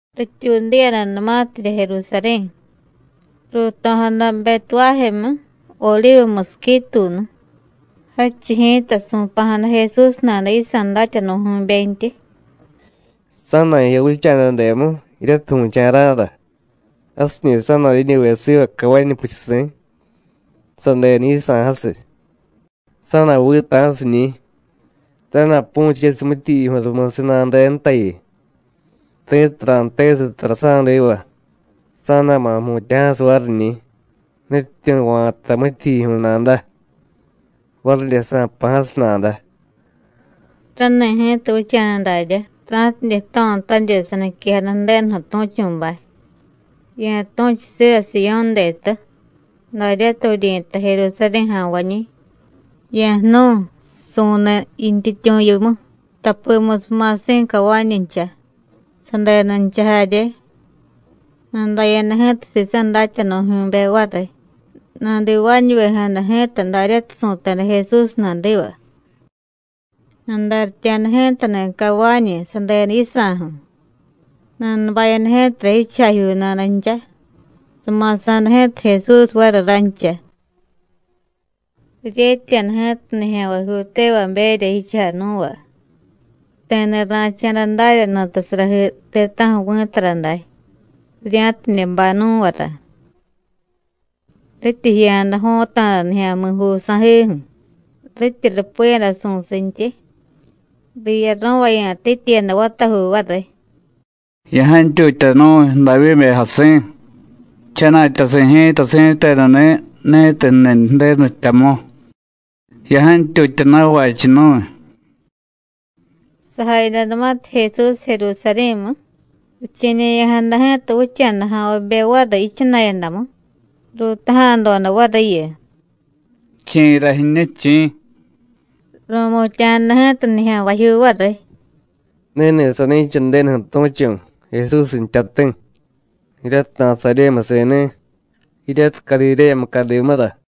Rityuudiyadanumatirya Jerusarí̱, ruuto̱jada Betuvájemu, Odivu musiquituunu. Jadchiy ji̱ta su̱pa̱jada Jesús nada yisa̱ datyanu̱jyu̱bentyi: “Sa̱na̱jiya vicha̱dademu jiryatiy vu̱cha̱ra̱ra. Jasiñi̱ sa̱na̱diñuve siva cavañu puchusi̱, sadenu yisa̱ jasiy. Sa̱na̱vita̱siñi̱, sa̱na̱pu̱chesiy mityijyijyu̱y rumusiy nanudenutayu. Ti̱tiy ra̱jtesiy tara sa̱diva, sa̱na̱ma̱ jmutya̱jasiy variñi̱: Nutyityu̱ va̱ta mityijyijyu̱y nada. Varidye sa̱jpa̱jasiy nada.” Rani̱ ji̱ta vicha̱da daryá, ra̱tidye jto̱tanirya saniquejada Ju̱denuju̱ tu̱chu̱bay: “Ya̱tu̱chu siva Siyó̱ detu daryatiy vuryi̱tay Jerusarí̱ ja̱nvañi̱: Ya̱jnu̱y, su̱niy yintyityu̱ yimu, tapimusiy ma̱si̱ cavañuncha, sadenuncha jarye.” Nadaya̱da ji̱ta sisa̱ datyanu̱jyu̱be variy, nadivaañuvejada ji̱ta daryatiy su̱teda Jesús nadiva. Nadaryitya̱da ji̱tani̱ cavañu, sadenu yisa̱ju̱. Nanubayada ji̱tara jichujajyuu nadancha, sama̱sa̱da ji̱ta Jesús variy rancha. Riryetya̱da ji̱ta nijya̱nvajyuu tevaberya jichujay nú̱va. Ti̱ni̱ ra̱cha̱da darya nutasarajii ti̱ta̱ju̱ vi̱tara day, rirya̱tidye bay nú̱vara. Rityi jiya̱da jo̱ta̱da nijya̱mi̱juu sa̱jiju̱, rityi rupiyada su̱sintyi, riyaro̱vaya̱tityiyada vatajuu variy: “¡Ya̱jantyutya nu̱y, Davyíbe jasi̱! ¡Jchana̱tyasi̱ ji̱ta si̱tenuni̱ ni̱tiy jniy Ju̱denu jtyamu! ¡Ya̱jantyutya na̱vachiy nu̱y!” Sajayadanumatiy Jesús Jerusarí̱mu, riche̱ñe̱ya̱jada ji̱ta vicha̱daja̱nvabe variy yichana̱yadamu, ruutaja̱doda variyu: “¿Chi̱ra jiñu, chi̱?” Ru̱mutya̱jada ji̱ta nijya̱nvajyuu variy: “Ni̱ni̱ sani̱cha Ju̱denuju̱ tu̱chu̱, Jesús jtyati̱, jiryatiy Nasaryémusi̱ni̱, jiryatiy Cadidéya mucadimura.”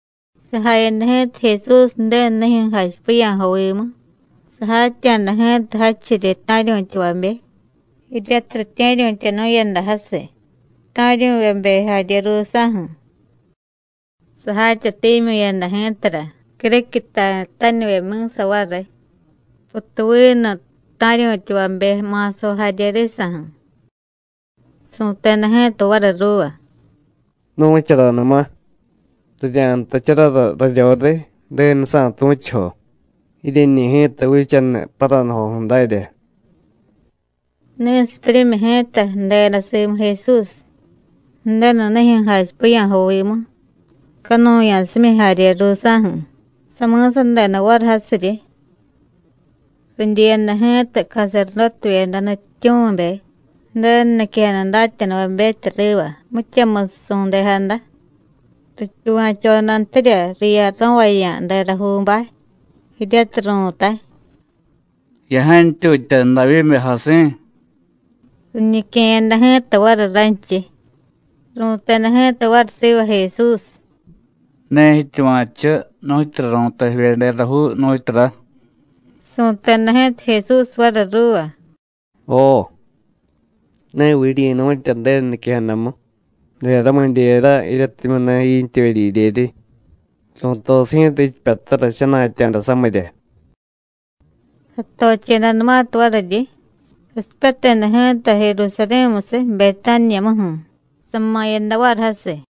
Sajayada ji̱ta Jesús Ju̱denunijyu̱ jachipiya̱jovimu, sajatya̱da ji̱ta jadchiryi ta̱ryu̱tyavabe, jiryatiy ritye̱ryu̱tyanu̱yada jasiy, ta̱ryu̱vyebe jarye ruusa̱ju̱. Sajatyatimyu̱yada ji̱tara criquiy ta̱ritanivyebe mi̱sa variy, putuvinu ta̱ryu̱tyavabe ma̱sajo jarye risa̱ju̱. Su̱teda ji̱ta variy ruuva: “Nu̱charanuma: Rirya̱jtacharara raryoriy Ju̱denusa̱ tu̱chujo, jiryeñi̱ ji̱ta vichaniy paranujoju̱ dárya.” Ni̱sipyuryimyi ji̱ta ju̱deda simu Jesús, Ju̱denunijyu̱ jachipiya̱jovimu, canuya̱simyi jarye ruusa̱ju̱, sami̱sadeda variy jasiryi. Ridyiyada ji̱ta caserdótevyeda nutyityu̱mibe, Ju̱denu niquejada datyanuvabetya riva mityamusiy su̱ndejada, rityuva̱chodantirya riyaro̱vaya̱ derajuubay, jiryatiy ru̱tay: “¡Ya̱jantyutya, Davyíbe jasi̱!” Riñique̱yada ji̱ta variy ranchiy. Ru̱teda ji̱ta variy siva Jesús: “¿Ne jityuva̱chu nu̱tyura ru̱tay jivye derajuu, nu̱tyura?” Su̱teda ji̱ta Jesús variy ruuva: “Jo. ¿Neviy jiryi̱nu̱tya Ju̱denu niquejadamu: Deramidyera, jiryatimyu̱ ne jiintyevye didyedyeryi, ru̱tosiy ji̱ta jichipyatara jchana̱tya̱da samirya?” Satochedanumatiy variryi, sasipyateda ji̱ta Jerusarí̱musiy Betániyamuju̱, sama̱yada variy jasiy.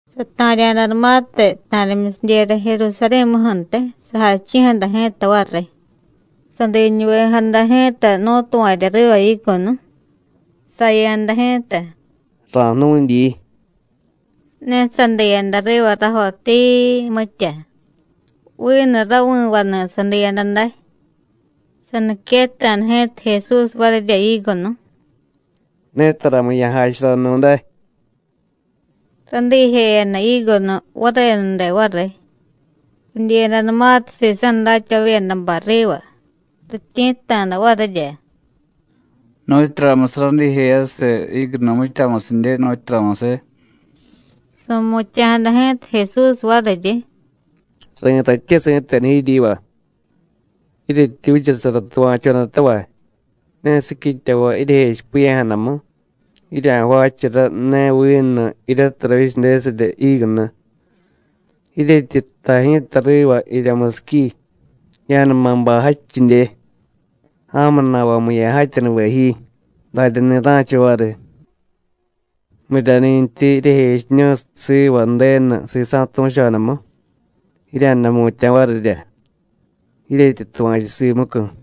Sata̱rya̱danumatiy ta̱rimyusidyera Jerusarí̱muju̱ntiy, sajachi̱jada ji̱ta variy. Sadiñuvejada ji̱ta nú̱tuva̱rya riva jígunu, saya̱da ji̱ta: “Ra̱jnu̱dyi,” ne sadiyada riva rajo tiii, mitya, vinu ravi̱vaniy sadiyada day. Saniquetta̱da ji̱ta Jesús varirya jígunu: “¡Ne taramu̱y ya̱jacharanu̱day!” Radiijeyada jígunu varenude variy. Ridyiyadanumatiy sisa̱ datyavavyedabay riva, rityi̱tta̱da varirya: “¿Nu̱tyuramusiy radiijeyasiy jígunu mityamusidye, nu̱tyuramusiy?” Su̱mutya̱jada ji̱ta Jesús variryi: “Ri̱tatye si̱tenu jiryiva: Jiryetyi vichasara tuva̱chodatavay, ne siquityavay jiryejechipiya̱jadamu, jirya̱jvaachara ne vinu jiryatiy ravyichadesirya jígunu. Jiryetyi jtay ji̱ta riva jirya musiqui: Ya̱numa bay jadchidye, ja̱mu na̱vamu ya̱jatyanuve ji, daryani̱ ra̱cha variy. Miryani̱ntyi jiryejechiñu̱y siva Ju̱denu sisa̱ tu̱chodamu, jirya̱day jmutya̱ varirya, jiryetyi tuva̱chu simucu̱.”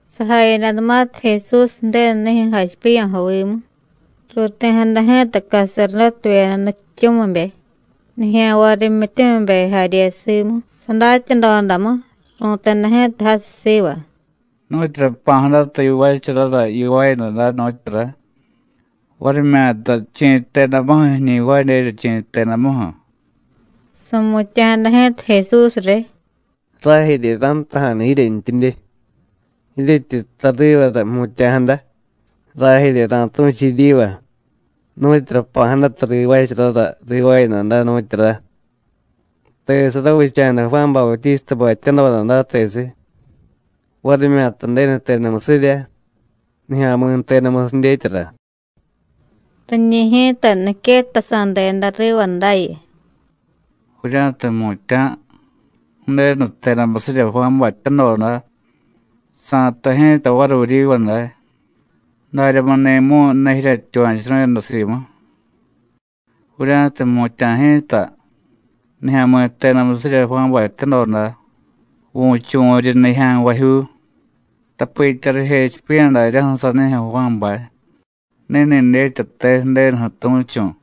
Sajayadanumatiy Jesús Ju̱denunijyu̱ jachipiya̱jovimu, ruuti̱jada ji̱ta caserdótevyeda nutyityu̱mibe, nijya̱nvay rimyityumibe jarye simu, sadatyadodamu, ru̱teda ji̱ta jasiy siva: “¿Nu̱tyura jpa̱jadata yivaacharara yivaayada day, nu̱tyura? varimyata ¿chi̱ jtedamuju̱ jiñi jvaadyerya, chi̱ jtedamuju̱?” Su̱mutya̱jada ji̱ta Jesús riy: “Rajerye ra̱jtaja̱nu jiryentyidye, jiryetyi jtay rivara jmutya̱jada, rajerye ra̱tu̱chu jiryiva nu̱tyura jpa̱jadata rivaacharara rivaayada day, nu̱tyura. ¿Tesiy ravicha̱da Juán Bautístabay jtyadoda day, tesiy? varimyata Ju̱denu jtedamusirya, nijya̱mi̱ jtedamusiy dyetyara.” Riñi̱ ji̱ta niquetasa̱deda riva dayu: “Vurya̱tiy jmutya̱: Ju̱denu jtedamusirya Juánbay jtyadoda, sa̱jtay ji̱ta variy vuryiva day: ¿Daryamuni̱mu̱y ne jiryetyuva̱churu̱yada simu? Vurya̱tiy jmutya̱ ji̱ta: Nijya̱mi̱ jtedamusirya Juánbay jtyadoda, vu̱chuvu̱ryi nijya̱nvajyuu, tapitya rijechipiya̱ daryaju̱ sanijyu̱ Juánbay: Ni̱ni̱ dyetyate Ju̱denuju̱ tu̱chu̱.”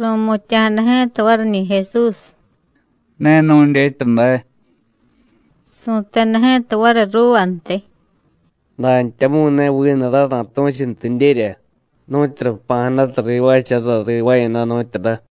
Ru̱mutya̱jada ji̱ta variñi̱ Jesús: “Ne nu̱dyetya day.” Su̱teda ji̱ta variy ruuvantiy: “Dantyamu̱y ne vinu ray ra̱tu̱chuntidyerya nu̱tyura jpa̱jadata rivaacharara rivaayada, nu̱tyura.”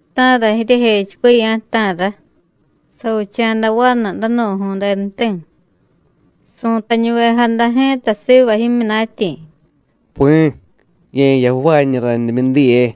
“¿Ta̱ra jiryejechipiya̱, ta̱ra? Savicha̱da vanu danu̱ju̱y denuti̱. Su̱tañuvejada ji̱ta siva jimyunatyi̱: ‘Pi̱, ye̱jiya ju̱vaañu randimyu diye.’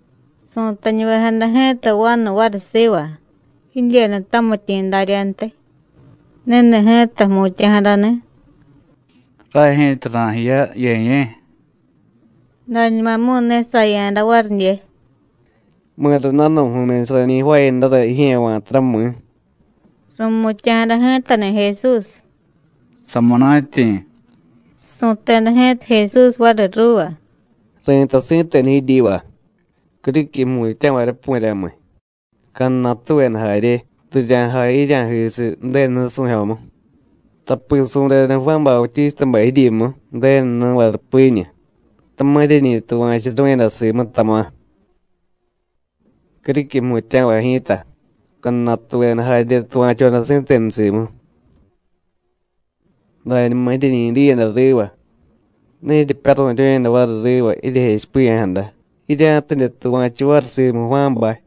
Su̱tañuvejada ji̱ta vanu variy siva jidyenu tamityi̱ daryantiy, ni̱ni̱ ji̱ta jmutya̱jadani̱: ‘Ray ji̱ta ra̱jiya, Ye̱ye̱.’ Dañumamu̱y ne saya̱da varidye. ¿Mi̱ra danu̱ju̱myusiy rañi jvaayadara jijye̱ va̱tara, mi̱?” Ru̱mutya̱jada ji̱tani̱ Jesús: “Samunatyi̱.” Su̱teda ji̱ta Jesús variy ruuva: “Ri̱tay si̱tenu jiryiva: Criquiy jmutya̱varyapu̱ryamiy, cadnatuveda jarye, rirya̱jay jirya̱jisiy Ju̱denu nusu̱jyomu. Tapi su̱deda Juán Bautístabay jiryimu Ju̱denu nú̱va rupiñu, tama̱ jiryeñi tuva̱churu̱yada simu, tama̱. Criquiy jmutya̱vay ji̱ta, cadnatuveda jarye tuva̱choda si̱tenu simu. Dañuma jiryeñi diyada riva, ne jiryepyaru̱ryu̱yada variy riva jijechipiya̱jada, jirya̱tidye tuva̱chu variy simu Juánbay.”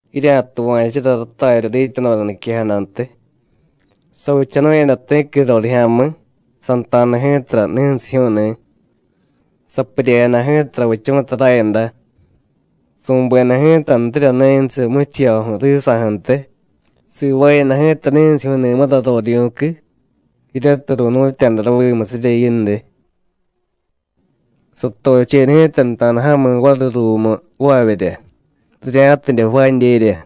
“Jirya̱tuva̱chura ratarya dityadoda niquejadantiy. Savichanu̱yada ti̱qui rorijya̱mi̱, santa̱da ji̱tara ni̱nsijyu̱u̱ni̱. Sapuryejada ji̱ta ravichu̱ta rayada; su̱beda ji̱tantirya ni̱nsiy muchijyoju̱ risa̱ju̱ntiy, sivaayada ji̱ta ni̱nsijyu̱u̱ni̱mura rorivyu̱qui, jiryatiy ru̱nu̱tya̱da ravimusirya yindiy. Satocheda ji̱ta nuta̱daja̱mi̱ variy ruumu jvaavyerya, rirya̱tidye jvaadyerya.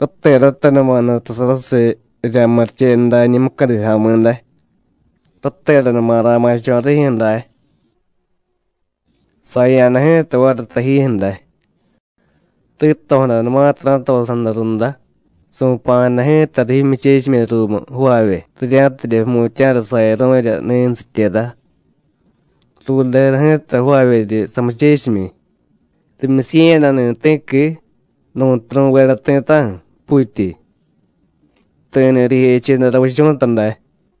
Rateratanuma nutasarasiy rirya̱murichenu dañi̱ mucadi ja̱mi̱ day, rateranuma ra̱ma̱cho̱ rijyu̱ day. Saya̱da ji̱ta variy tajijyu̱ day. Rito̱jadanumatiy ra̱tosa̱da runda, su̱pa̱jada ji̱tariy jimyuchechimyi ruumu jvaavye, rirya̱tidye jmutya̱ra sayaru̱rya ni̱nusityera. Rureda ji̱ta jvaavyeryi samuchechimyi, rimyusiye̱yadani̱ ti̱qui, nu̱ntiy ru̱veda ti̱ta̱ju̱, puutyi. Ti̱ni̱ rijecheda ravichu̱ta day.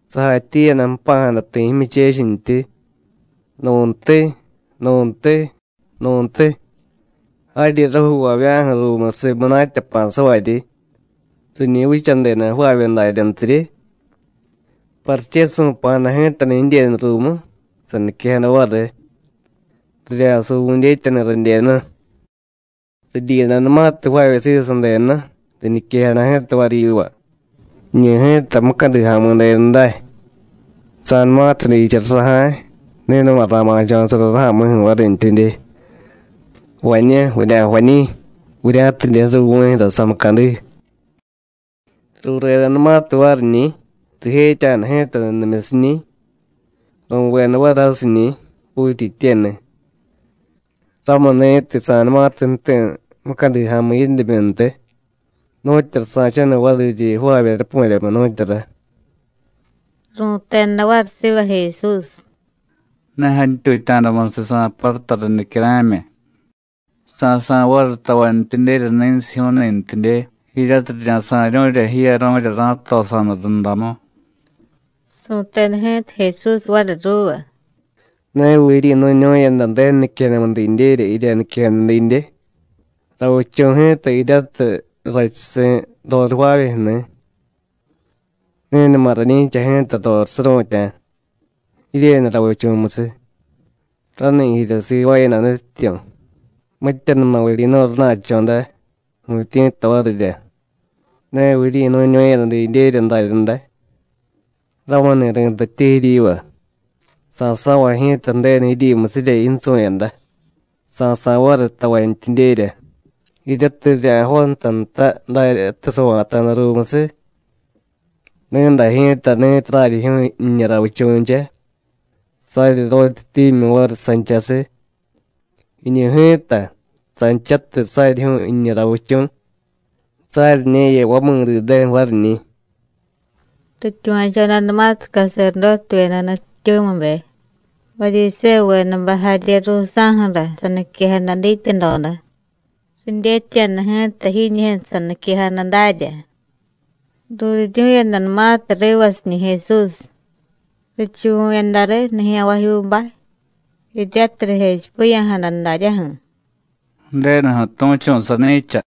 Sajatyiiyada jpa̱jada ti̱ jimyuchechintyi, nu̱ntiy, nu̱ntiy, nu̱ntiy, jaryi rajuuvavya̱ju̱ ruumusiy munatya jpa̱savaryi, riñi vichadeda jvaavye daryantyiryi. Pariche su̱pa̱jada ji̱tani̱ jidyenu ruumu, saniquejada variy: Rirya̱suvu̱y dyetyani̱ radyenu. Ridyiyadanumatiy jvaavye siva sadenu, riñiquejada ji̱ta variy yiva: Jiñu ji̱ta mucadi ja̱mi̱ denu day. Sa̱numatiy diichara saja̱y, ni̱numa ra̱ma̱cho̱sara raja̱mi̱ju̱ varintyidye. Vañú, vurya̱jvañi̱, vurya̱tidye ju̱riy vu̱jyu̱ra samucadi. Ruredanumatiy variñi̱, rijetya̱da ji̱ta nudimyusiñi̱, ru̱veda variy jasiñi̱, puutyityeni̱. Ramuni̱tiy, sa̱numatiy jti̱ mucadi ja̱mi̱ yindimyuntiy, ¿nu̱tyura sa̱chaniy variryi jvaavye rapu̱ryamiy, nu̱tyura?” Ru̱teda variy siva Jesús: “Ne jantyutya̱damusiy sa̱paruta riy nicyara̱myi, sa̱sa̱y variy tavantyidyerya ni̱nsijyu̱u̱ni̱ntidye, jiryatiy rirya̱sa̱ryu̱rya jiyaru̱rya ra̱tosa̱da rundamu.” Su̱teda ji̱ta Jesús variy ruuva: “¿Neviy jiryi̱nu̱ñu̱yada Ju̱denu niquejadamu didyerya jirya niquejada didye? Ravichu̱ ji̱ta jiryatiy rrachusi̱ roriy jvaavyejyu̱ni̱, ni̱numa rañi̱cha ji̱ta roriy suru̱tya̱, jiryenu ravichu̱musiy. Rani̱ jirya sivaayada Nutyityu̱, mityanuma vuryi̱nu̱y rana̱cho̱ day, vu̱tyi̱tta varirya. ¿Neviy jiryi̱nu̱ñu̱yada didyerya daryaday? Ramuni̱ ri̱tatye jiryiva: Sa̱so̱vay ji̱ta Ju̱denu jiryimusirya yinsu̱yada, sa̱sa̱y variy tavantyidyerya jiryatiy rirya̱jontay nta daryatiy sava̱ta̱da ruumusiy. Ni̱day ji̱ta ni̱tiy raryijyu̱u̱y jiñu ravichu̱ncha, saryiryotyatimyu̱y variy sanchasiy; jiñu ji̱ta, sanchatiy saryijyu̱u̱y jiñu ravichu̱, saryiñe̱ya vamidideju̱ variñi̱.” Rityuva̱chodanumatiy caserdótevyeda nutyityu̱mibe, Varyisévuvedabay jarye ruusa̱ju̱ra saniquejada dityadoda, ridyetya̱da ji̱ta jiñijyu̱ saniquejada darya. Ruuriryu̱yadanumatiy rivasiñi̱ Jesús, richuvu̱yada riy nijya̱nvajyuubay, jiryatiy rijechipiya̱jada daryaju̱: “Ju̱denuju̱ tu̱chu̱ sani̱cha.”